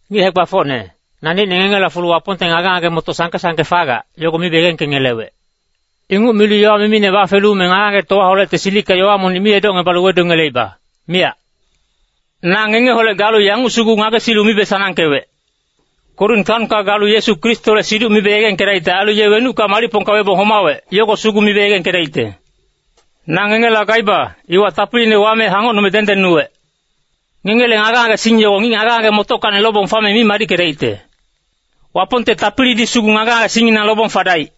Ngic hae-gbafocne, naneicne ngengela fulu Wapongte ngage-ngage-motoc sangke-sangke fagac, yogo mibe yegengkengelewec. Inguc milu yowa mimine bafelu me ngage-ngagetowaholecte silicka yowa monic mi edocngebalu wedungeleiba, miyac. Na ngengeholec galu yanguc sugu ngagesilu mibe sanangkewec, “Korin taonka galu Yesu Kristole siduc mibe yegengkedaicte, ailu ye wenucka malicpongka webong homawec, yogo sugu mibe yegengkedaicte.” Na ngengela gaiba, iwa tapiline wame hangocnume dengdengnuwec. Ngengele ngage-ngagesing yogo ngic ngage-ngage-motockacni lobong fame mi madickedaicte. Wapongte tapilidi sugu ngage-ngagesingnginang lobong fadaic.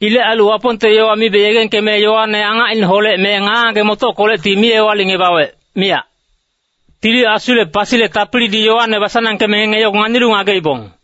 Ilec ailu Wapongte yowa mibe yegengkeme yowane angacineholec me ngage-ngage-motockolecti mi ewalicngebawec, miyac. Tili Asule pasile tapilidi yowane basanangkeme ngenge yogo nganilu ngageibong.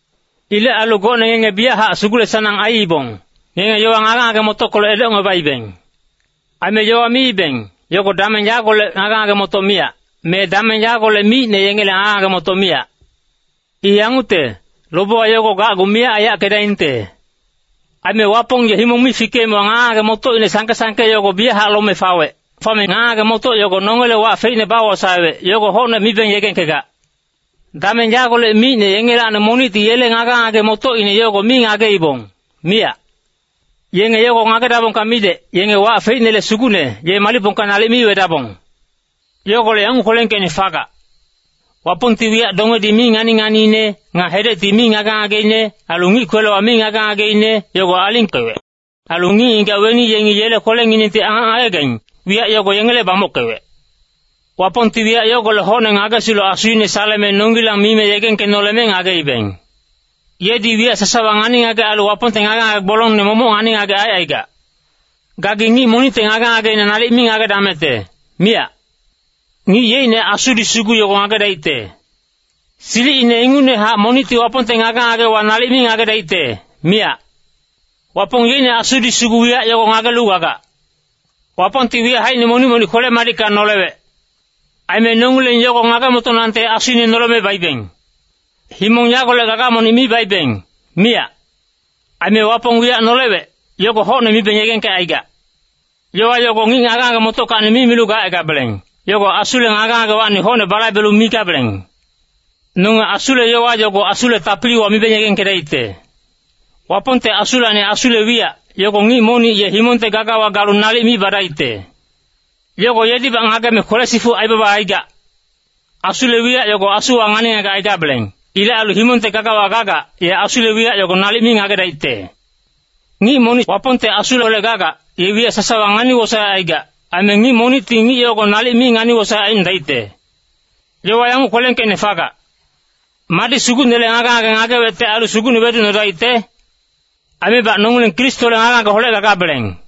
Ilec ailu gocne ngenge biyachac sugule-sanang aiibong, ngenge yowa ngage-ngage-motockolec edocngebaibeng. Aime yowa miibeng, yogo dameng yagolec ngage-ngage-motoc miyac, me dameng yagolec micne yengele ngage-ngage-motoc miyac. I yangucte, lobewa yogo gacgu miyac aiyackedaingte. Aime Wapong ye himong mi fikeemewa ngage-ngage-motocine sangke-sangke yogo biyachac lome fawec. Fame ngage-ngage-motoc yogo nongele wac feicne bawosaewec, yogo hocne mibeng yegengkegac. Dameng yagolec micne yengelacni monicti yele ngage-ngage-motocine yogo mi ngageibong, miyac. Yenge yogo ngagedabongka midec, yenge wac feicnele Sugucne, ye malicpongka nalic mi wedabong. Yogolec yanguc kwelengkeicne fagac, “Wapongti wiyac dongedi mi ngani-nganiine, nga hedecti mi ngage-ngageine, ailu ngic kwelewa mi ngage-ngageine, yogo alingkewec. Ailu ngic-ngigac weni yengi yele kwelenginengti angac ngagegaing, wiyac yogo yengele bamockewec.” Wapongti wiyac yogolec hocne ngagesilu Asuine saleme nongilang mime yegengkenoleme ngageibeng. Yedi wiyac sasawa ngani-ngagec ailu Wapongte ngage-ngage gbolongne momoc ngani-ngagec aicaigac. Gagi ngic monicte ngage-ngageina nalic mi ngagedamecte, miyac. Ngic yeicne asudi sugu yogo ngagedaicte. Silicine ingucnehac monicti Wapongte ngage-ngagewa nalic mi ngagedaicte, miyac. Wapong yeicne Asudi sugu wiyac yogo ngagelu gagac. Wapongti wiyac haicine monic-monic kwele-madicka nolewec. Aime nongileng yogo ngage-motonangte Asuine noleme baibeng. Himong yagolec gaga monic mi baibeng, miyac. Aime Wapong wiyac nolewec, yogo hocne mibeng yegengkecaigac. Yowa yogo ngic ngage-ngage-motockacni mi milu gacaigabeleng, yogo Asule ngage-ngagewacni hocne balaibelu migabeleng. Nonge Asule yowa yogo Asule tapiliwa mibeng yegengkedaicte. Wapongte Asulacni Asule wiyac, yogo ngic monic ye himongte gagawa galu nalic mi badaicte. Yogo yedibac ngageme kwele-sifuc aibaba aigac. Asule wiyac yogo asuwa ngani-ngagec aigabeleng. Ilec ailu himongte gagawa gagac, ye Asule wiyac yogo nalic mi ngagedaicte. Ngic monic Wapongte Asuholec gagac, ye wiyac sasawa ngani-wosaec aigac. Aime ngic monicti ngic yogo nalic mi ngani-wosaec aicnodaicte. Yowa yanguc kwelengkeicne fagac, “Madi Sugucnele ngage-ngage ngagewecte ailu Sugucne weducnodaicte?” Aimebac nongileng Kristole ngage-ngageholec gagabeleng.